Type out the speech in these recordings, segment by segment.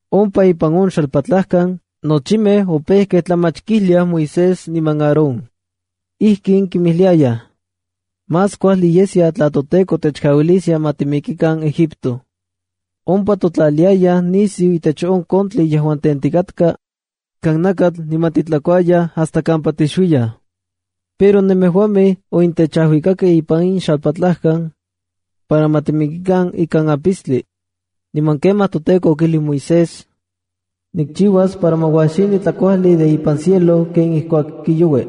Ompa ipan on xalpatlajkan, nochimej opejkej tlamach kijliaj Moisés niman Aarón. Ijkin kinmijliayaj: —Más kuajli yeskia tla toTEKO techkauiliskia ma timikikan Egipto. Ompa titotlaliayaj nisiu itech on kontli yejuan tentikatka ikan nakatl niman titlakuayaj hasta kampa tixuiyaj. Pero nemejuamej onentechajuikakej ipan in xalpatlajkan para ma timikikan ikan apistli. Niman kemaj toTEKO okijlij Moisés: —Nikchiuas para ma uajxini tlakuajli de ipan cielo ken ijkuak kiaui.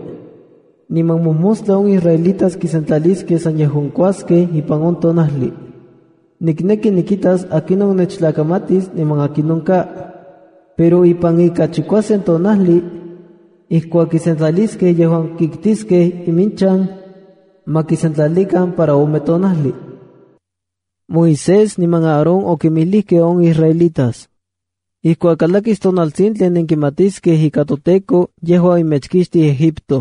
Niman mojmostla on israelitas kisentlaliskej san yejuan kikuaskej ipan on tonajli. Nikneki nikitas akinon nechtlakamatis niman akinon ka. Pero ipan ika chikuasen tonajli ijkuak kisentlaliskej yejuan kiktiskej iminchan, ma kisentlalikan para ome tonajli. Moisés niman Aarón okinmijlijkej on israelitas: —Ijkuak kalakis tonaltsintli nenkimatiskej ika toTEKO yejua omechkixtij Egipto.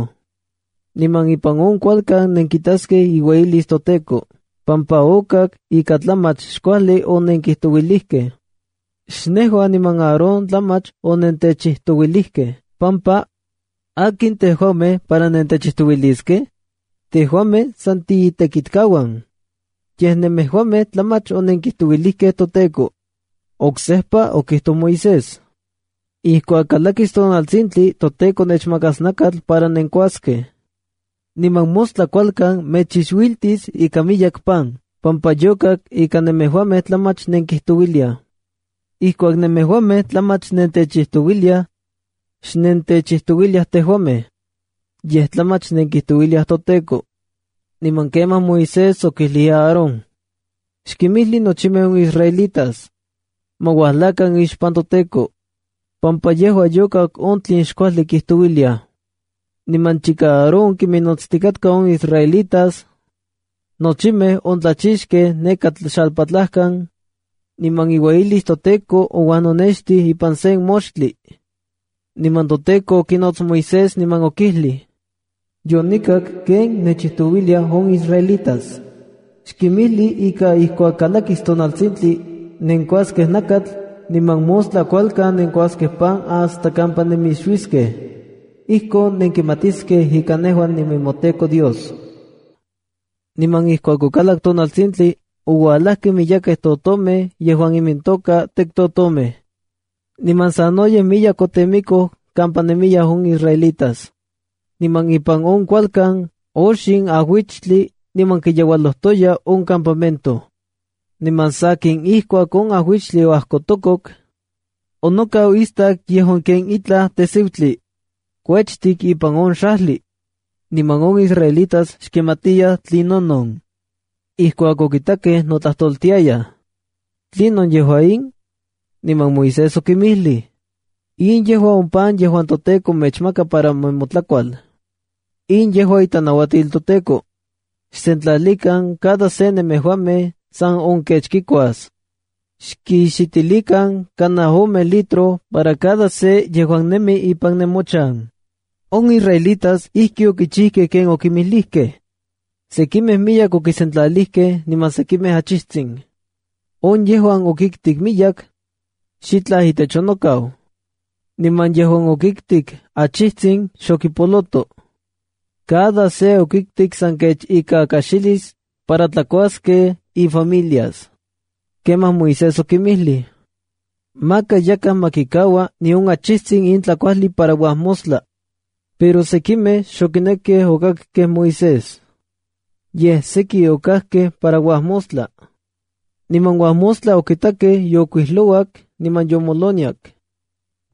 Niman ipan on kualkan nenkitaskej iueyilis toTEKO, pampa okak ika tlamach xkuajli onenkijtouilijkej. Xnejua niman Aarón tlamach onentechijtouilijkej pampa ¿Akin tejuamej para nentechijtouiliskej? Tejuamej san tiitekitkauan. Yej Nemejuamej tlamach onenkijtouilijkej toTEKO. Oksejpa okijtoj Moisés: —Ijkuak kalakis tonaltsintli toTEKO mechmakas nakatl para nenkuaskej, niman mostla kualkan mechixuiltis ika miyek pan, pampa yokak ika nemejuamej tlamach nenkijtouiliaj. Ijkuak nemejuamej tlamach nentechijtouiliaj, xnentechijtouiliaj tejuamej, yej tlamach nenkijtouiliaj, toTEKO. Niman kemaj Moisés okijlij Aarón: —Xkinmijli nochimej on israelitas: “Ma uajlakan ixpan toTEKO, pampa yejua yokak on tlen xkuajli kijtouiliaj.” Niman chika Aarón kiminnotstikatka on israelitas, nochimej ontlachixkej neka xalpatlajkan, niman iueyilis toTEKO ouajnonextij ipan sen moxtli. Niman toTEKO okinots Moisés niman okijlij: —Yonikak ken nechijtouiliaj on israelitas. “Xkimijli ika ijkuak kalakis tonaltsintli, nenkuaskej nakatl, niman mostla kualkan nenkuaskej pan hasta kampa nemixuiskej. Ijkon nenkimatiskej ika nejua ninemoTEKO Dios.” Niman ijkuak okalak tonaltsintli oualajkej miyekej totomej yejuan imintoka tektotomej, niman sanoyej miyek otemikoj kampa nemiyaj on israelitas. Niman ipan on kualkan oxin ajuichtli niman kiyeualojtoya on campamento. Niman sakin, ijkuak on ajuichtli oajkotokok, onokau istak yejuan ken itlaj tejsiutli kuechtik ipan on xajli. Niman on israelitas xkimatiyaj tlinonon. Ijkuak okitakej notlajtoltiayaj: “¿Tlinon yejua in?” Niman Moisés okinmijlij: —In yejua on pan yejuan toTEKO mechmaka para nemotlakual. In yejua itlanauatil toTEKO: “Xsentlalikan cada se nemejuamej san on kech kikuas. Xkixitilikan kanaj ome litro para cada se yejuan nemi ipan nemochan.” On israelitas ijki okichijkej ken okinmijlijkej. Sekimej miyek okisentlalijkej niman sekimej achijtsin. On yejuan okiktik miyek, xitlaj itech onokau. Niman yejuan okiktik achijtsin xokipoloto. Cada se okiktik san kech ika kaxilis para tlakuaskej ifamilias. Kemaj Moisés okinmijlij: —Maka yakaj ma kikaua nion achijtsin in tlakuajli para uajmostla. Pero sekimej xokinekkej okakkej Moisés. Yej seki okajkej para uajmostla. Niman uajmostla okitakej yookuijlouak niman yomoloniak.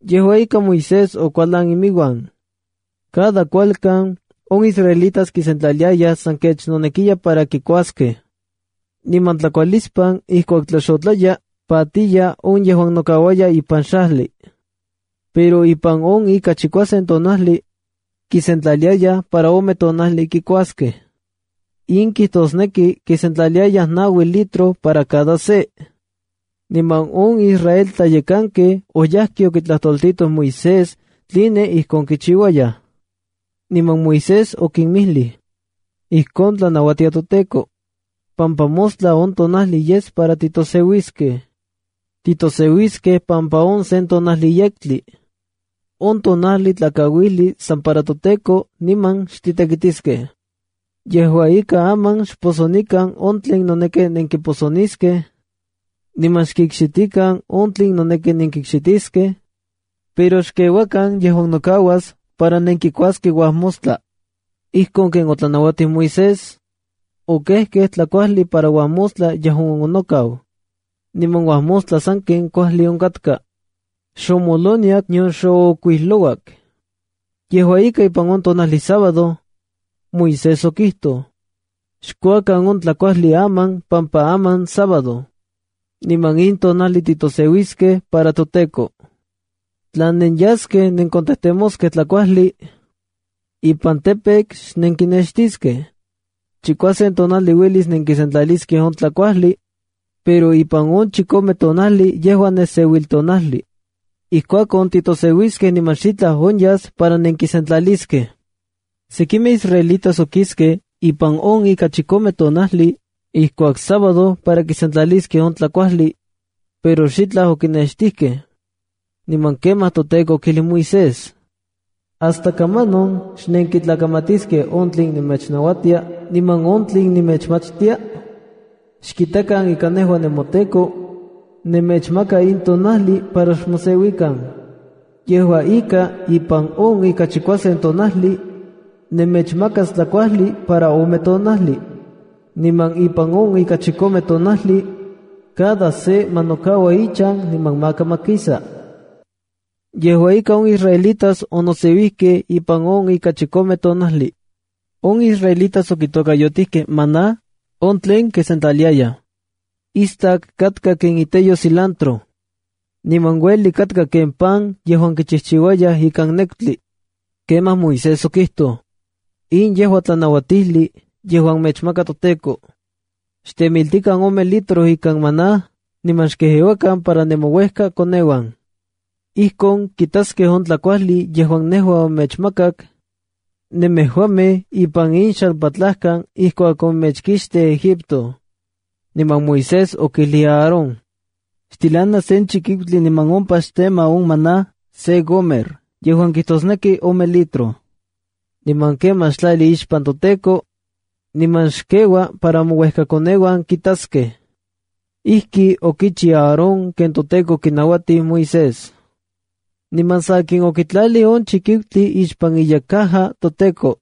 Yejua ika, Moisés okualan iminuan. Cada kualkan, on israelitas kisentlaliayaj san kech nonekiya para kikuaskej, niman tlakualispan ijkuak tlaxotlaya patiya on yejuan nokauaya ipan xajli. Pero ipan on ika chikuasen tonajli, kisentlaliayaj para ome tonajli kikuaskej. In kijtosneki kisentlaliayaj naui litro para cada se. Niman on israel tlayekankej oyajkej okitlajtoltitoj Moisés tline ijkon kichiuayaj. Niman Moisés okinmijlij: —Ijkon tlanauatia toTEKO, pampa mostla on tonajli yes para titoseuiskej. Titoseuiskej pampa on sen tonajli yektli. On tonajli tlakauijli san para toTEKO niman xtitekitiskej. Yejua ika, aman xposonikan on tlen noneki nenkiposoniskej, niman xkikxitikan on tlen noneki nenkikxitiskej, pero xkeuakan yejuan nokauas para nenkikuaskej uajmostla. Ijkon ken otlanauatij Moisés, okejkej tlakuajli para uajmostla on yejuan onokau. Niman uajmostla saken kuajli onkatka. Xomoloniak nion xookuijlouak. Yejua ika, ipan on tonajli sábado, Moisés okijtoj: —Xkuakan on tlakuajli aman pampa aman sábado, niman in tonajli titoseuiskej para toTEKO. Tla nenyaskej nenkontejtemoskej tlakuajli ipan campo xnenkinextiskej. Chikuasen tonajli uelis nenkisentlaliskej on tlakuajli, pero ipan on chikome tonajli yejua neseuiltonajli. Ijkuakon, titoseuiskej niman xitlaj onyas para nenkisentlaliskej. Sekimej israelitas okiskej ipan on ika chikome tonajli ijkuak sábado para kisentlaliskej on tlakuajli, pero xitlaj okinextijkej. Niman kemaj toTEKO okijlij Moisés: —¿Hasta kamanon xnenkintlakamatiskej on tlen nemechnauatia niman on tlen nemechmachtia? Xkitakan ika nejua, nemoTEKO, nemechmaka in tonajli para xmoseuikan. Yejua ika, ipan on ika chikuasen tonajli nemechmakas tlakuajli para ome tonajli. Niman ipan on ika chikome tonajli cada se ma nokaua ichan niman maka ma kisa. Yejua ika, on israelitas onoseuijkej ipan on ika chikome tonajli. On israelitas okitokayotijkej “maná”a on tlen kisentlaliayaj. Istak katka ken iteyo cilantro, niman uelik katka ken pan yejuan kichijchiuayaj ikan nekutli. Kemaj Moisés okijtoj: —In yejua tlanauatijli yejuan mechmaka toTEKO: “Xtemiltikan ome litro ikan maná niman xkejeuakan para nemouejkakoneuan. Ijkon kitaskej on tlakuajli yejuan nejua onemechmakak nemejuamej ipan in xalpatlajkan ijkuak onemechkixtij Egipto.” Niman Moisés okijlij Aarón: —Xtilana sen chikiutli niman ompa xtema on maná se gomer yejuan ome litro maná. Niman kemaj xtlali ixpan toTEKO niman xkeua para mouejkakoneuan kitaskej. Ijki okichiu Aarón ken toTEKO okinauatij Moisés. Niman sakin, okitlalij on chikiutli ixpan iyekcaja toTEKO.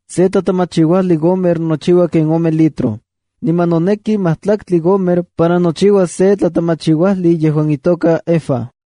(Se tlatemachiuajlij gomer, nochiua ken ome litro. Niman noneki majtlaktli gomer para nochiuas se tlatemachiuajlij yejuan itoka efab.)